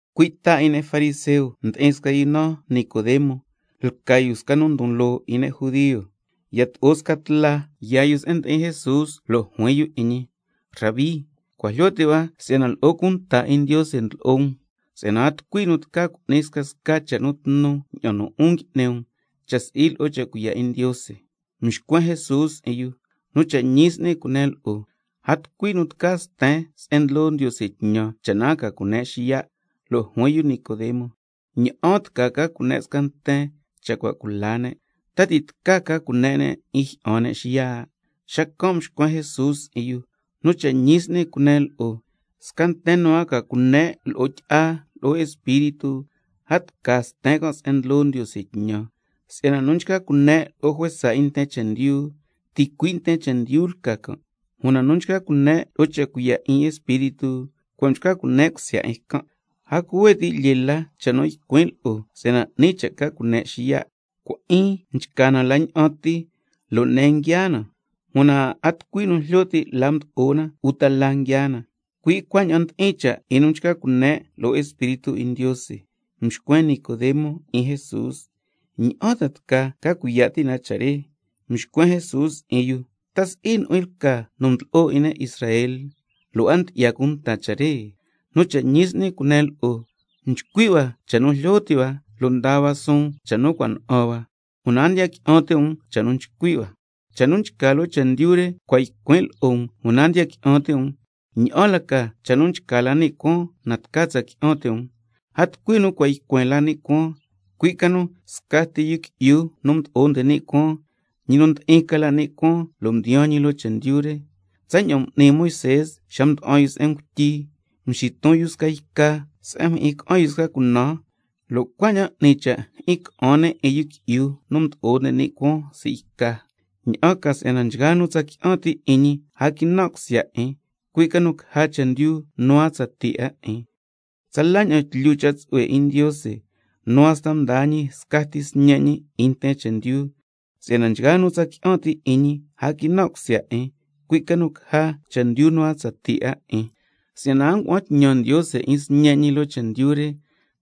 Cui' ta 'in ne' fariseo ndi'in sca yu naan Nicodemo, lca yu sca nu ndon loo 'in ne' judio. Yato'o sca tla yaa yu se'en ndi'in Jesús, lo' juin yu 'in ñi: Rabí, cua' jlyo ti' hua si'yana lo'o cunta 'in Ndiose ndlo'o um, si'yana a tucui nu tca cu'ni scasca cha' nu tnu ña'an nu 'un ngui'ni um, cha' si'i lo'o cha' cuiya' 'in Ndiose. Mxcuen Jesús 'in yu: Nu cha' ñi s'ni cunen lo'o, a tucui nu tca sten se'en ndlo Ndiose tñan cha' na a chca cune' xiya'. Lo' juin yu Nicodemo: ¿Ña'an tca ca cune' sca nten cha' cua' cula ne'? ¿Ta ti' tca ca cune' ne' 'in jyi'an ne' xiya'? Xacan' mxcuen Jesús 'in yu: Nu cha' ñi s'ni cunen lo'o, sca nten nu a ca cune' lo'o tyi'a, lo'o Espíritu, a tca sten can' se'en ndlo Ndiose tñan. Si'yana nu nchca cune' lo'o juesa 'in nten chendyu, ticui' nten chendyu lca can', una nu nchca cune' lo'o cha' cuiya' 'in Espíritu, cua' mchca cune' cusya 'in can'. A cuhue ti' lyee la cha' nu ycuin' lo'o si'yana 'ni cha' ca cune' xiya'. Cui'in nchca na la ña'an ti, lo' ne nguiaa na, una a tucui jlyo ti' la mdo'o na uta la nguiaa na, cui' cuaña'an ndi'in cha' 'in nu nchca cune' lo'o Espíritu 'in Ndiose. Mxcuen Nicodemo 'in Jesús: ¿Ña'an tca ca cuiya' ti' na cha' re? Mxcuen Jesús 'in yu: ¿Ta si'i nu'huin lca nu ndlo'o 'in ne' Israel, lo' a ndyi'ya cunta cha' re? Nu cha' ñi s'ni cunen lo'o, nchcui' hua cha' nu jlyo ti' hua lo' ndaa hua suun cha' nu cua' na'an hua, una a ndiya qui'an ti' um cha' nu nchcui' hua. Cha' nu nchca loo chendyu re cua' ycuin' lo'o um una a ndiya qui'an ti' um, ¿ña'an la ca cha' nu nchca la ni' cuaan na tca tsa qui'an ti' um? A tucui nu cua' ycuen la ni' cuaan, cui' ca nu scati Yu Qui'yu nu Mdo'o nde ni' Cuaan, ñi nu ndi'in ca la ni' cuaan mdiyaan loo chendyu re. Tsaña'an m'ni Moisé xa mda'an yu se'en ngutyi, mxiton yu sca yca se'en mjyi'in ca'an yu cunaan, lo' cuaña'an 'ni cha' jyi'in ca'an ne' 'ñan sii' yca, Nan' Yu Qui'yu nu Mdo'o nde ni' Cuaan, ña'an ca si'yana nchgaa nu tsa qui'an ti' 'in ñi a quinan' cusya 'in, cui' ca nu caja chendyu nu a tsatii 'a 'in. Tsala ña'an tlyu cha' tsu'hue 'in Ndiose, nu hasta mdaa ñi scati Sñe' ñi 'in nten chendyu, si'yana nchgaa nu tsa qui'an ti' 'in ñi a quinan' cusya 'in, cui' ca nu caja chendyu nu a tsatii 'a 'in. Si'yana a ngua'an tñan Ndiose 'in Sñe' ñi loo chendyu re,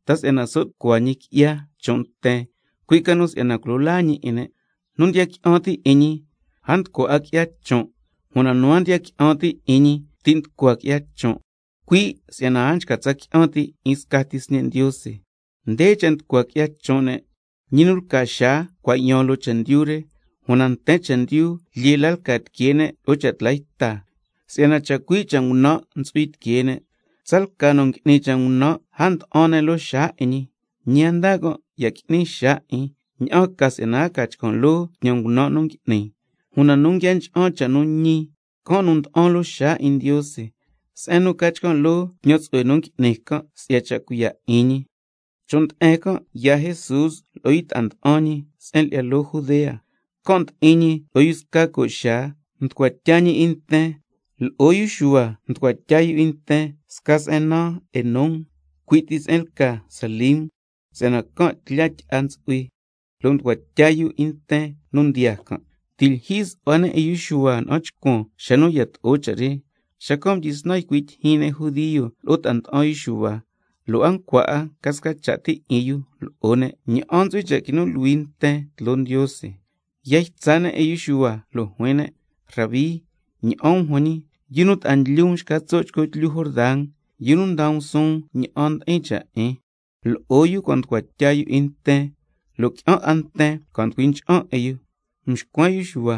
ta si'yana so' tucua ñi qui'ya chon' nten, cui' ca nu yaan ñi si'yana culo laa ñi 'in ne'. Nu ndiya qui'an ti' 'in ñi, a nducua 'a qui'ya chon', una nu a ndiya qui'an ti' 'in ñi ti' nducua qui'ya chon', cui' si'yana a nchca tsa qui'an ti' 'in scati Sñe' Ndiose. Nde cha' nducua qui'ya chon' ne': Si'yana ñi nu lca xaa cua' yaan loo chendyu re, una nten chendyu lyee la lca tiquee ne' lo'o cha' tla yta, si'yana chacui' cha' ngunan' ntsu'hui tiquee ne'. Si'yana tsalca nu ngui'ni cha' ngunan' a ndyi'an ne' loo xaa 'in ñi, ñi a ndaa can' ya' qui'ni xaa 'in, se'en nu a ca chcan' loo tñan ngunan' nu ngui'ni. Una nu nguia ncha'an cha' nu ñi, can' nu ndyi'an loo xaa 'in Ndiose, se'en nu ca chcan' loo tñan tsu'hue nu ngui'ni can' si'ya cha' cuiya' 'in ñi. Chon' nde'en can' yaa Jesús lo'o yu ta'a nda'an ñi se'en lyi'ya loo Judea, can' mdi'in ñi lo'o yu sca co' xaa, mducua tya ñi 'in nten. Lo'o yu Xuhua mducua tya yu 'in nten sca se'en naan Enón, cui' ti se'en lca Salim, si'yana can' tlya tyi'a ntsu'hui, lo' mducua tya yu 'in nten nu mdiyaa can'. Ti' lyijyi su'hua ne' 'in yu Xuhua na'an chcuan xa m'ni yu cha' re. Xacan' mdyisnan ycui' tyijyin ne' judio lo'o ta'a nda'an yu Xuhua, lo' a ncua ca sca cha' ti 'in yu lo'o ne' ña'an ntsu'hui cha' quinu luhui nten tloo Ndiose. Ya ytsa' ne' 'in yu Xuhua lo' juin ne': Rabí, ña'an um jan ñi, yu nu ta'a nguilyu um xca tso' chco tlyu Jordan, yu nu mdaa um suun ña'an ndi'in cha' 'in, lo'o yu cua' nducua tya yu 'in nten, lo' qui'an 'a nten cua' nducui ncha'an 'in yu. Mxcuen yu Xuhua: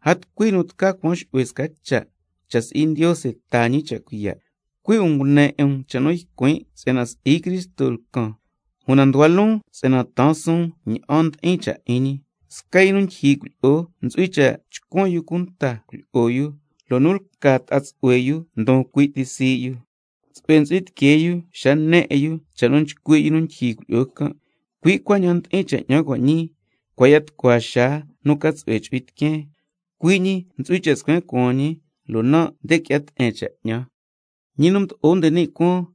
A tucui nu tca cuan xu'hue sca cha', cha' si'i Ndiose taa ñi cha' cuiya'. Cui' um ngune 'in um cha' nu ycuin' si'yana si'i Cristo lcan, una mducua loon si'yana taan suun ña'an ndi'in cha' 'in ñi. Sca yu nu ndyijyi cuilyi'o ntsu'hui cha' chcuan yu cunta 'in cuilyi'o yu. Lo' nu lca ta'a tsu'hue yu ndon cui' ti sii' yu, tsu'hue ntsu'hui tiquee yu xa ne 'in yu cha' nu nchcui' yu nu ndyijyi cuilyi'o can'. Cui' cuaña'an ndi'in cha' 'ñan cua' ñii, cua' ya tucua xaa nu ca tsu'hue chu'hui tiqueen. Cui' ñi ntsu'hui cha' scuen cuaan ñi, lo' nan' nde qui'ya te'en cha' 'ñan. Ñi nu mdo'o nde ni' cuaan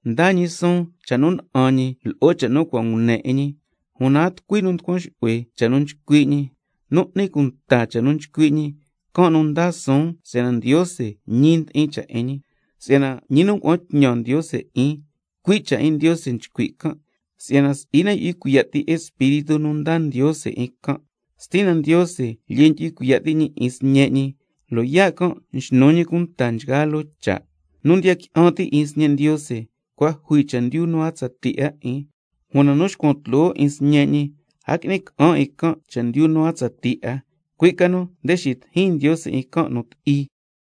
Ndaa ñi suun cha' nu na'an ñi lo'o cha' nu cua' ngune 'in ñi, una a tucui nu nducuan xu'hue cha' nu nchcui' ñi. Nu n'ni cunta cha' nu nchcui' ñi, can' nu ndaa suun si'yana Ndiose ñi ndi'in cha' 'in ñi. Si'yana ñi nu ngua'an tñan Ndiose 'in, cui' cha' 'in Ndiose nchcui' can', si'yana si'i na ndyu'hui cuiya' ti Espíritu nu ndaa Ndiose 'in can'. Stina Ndiose lyee ndyu'hui cuiya' ti' ñi 'in Sñe' ñi, lo' yaa' can' mxnu ñi cunta nchgaa loo cha'. Nu ndiya qui'an ti' 'in Sñe' Ndiose, cua' jui chendyu nu a tsatii 'a 'in, una nu xcuan tloo 'in Sñe' ñi, a qui'ni ca'an 'in can' chendyu nu a tsatii 'a, cui' ca nu nde xitijin Ndiose 'in can' nu ti'i.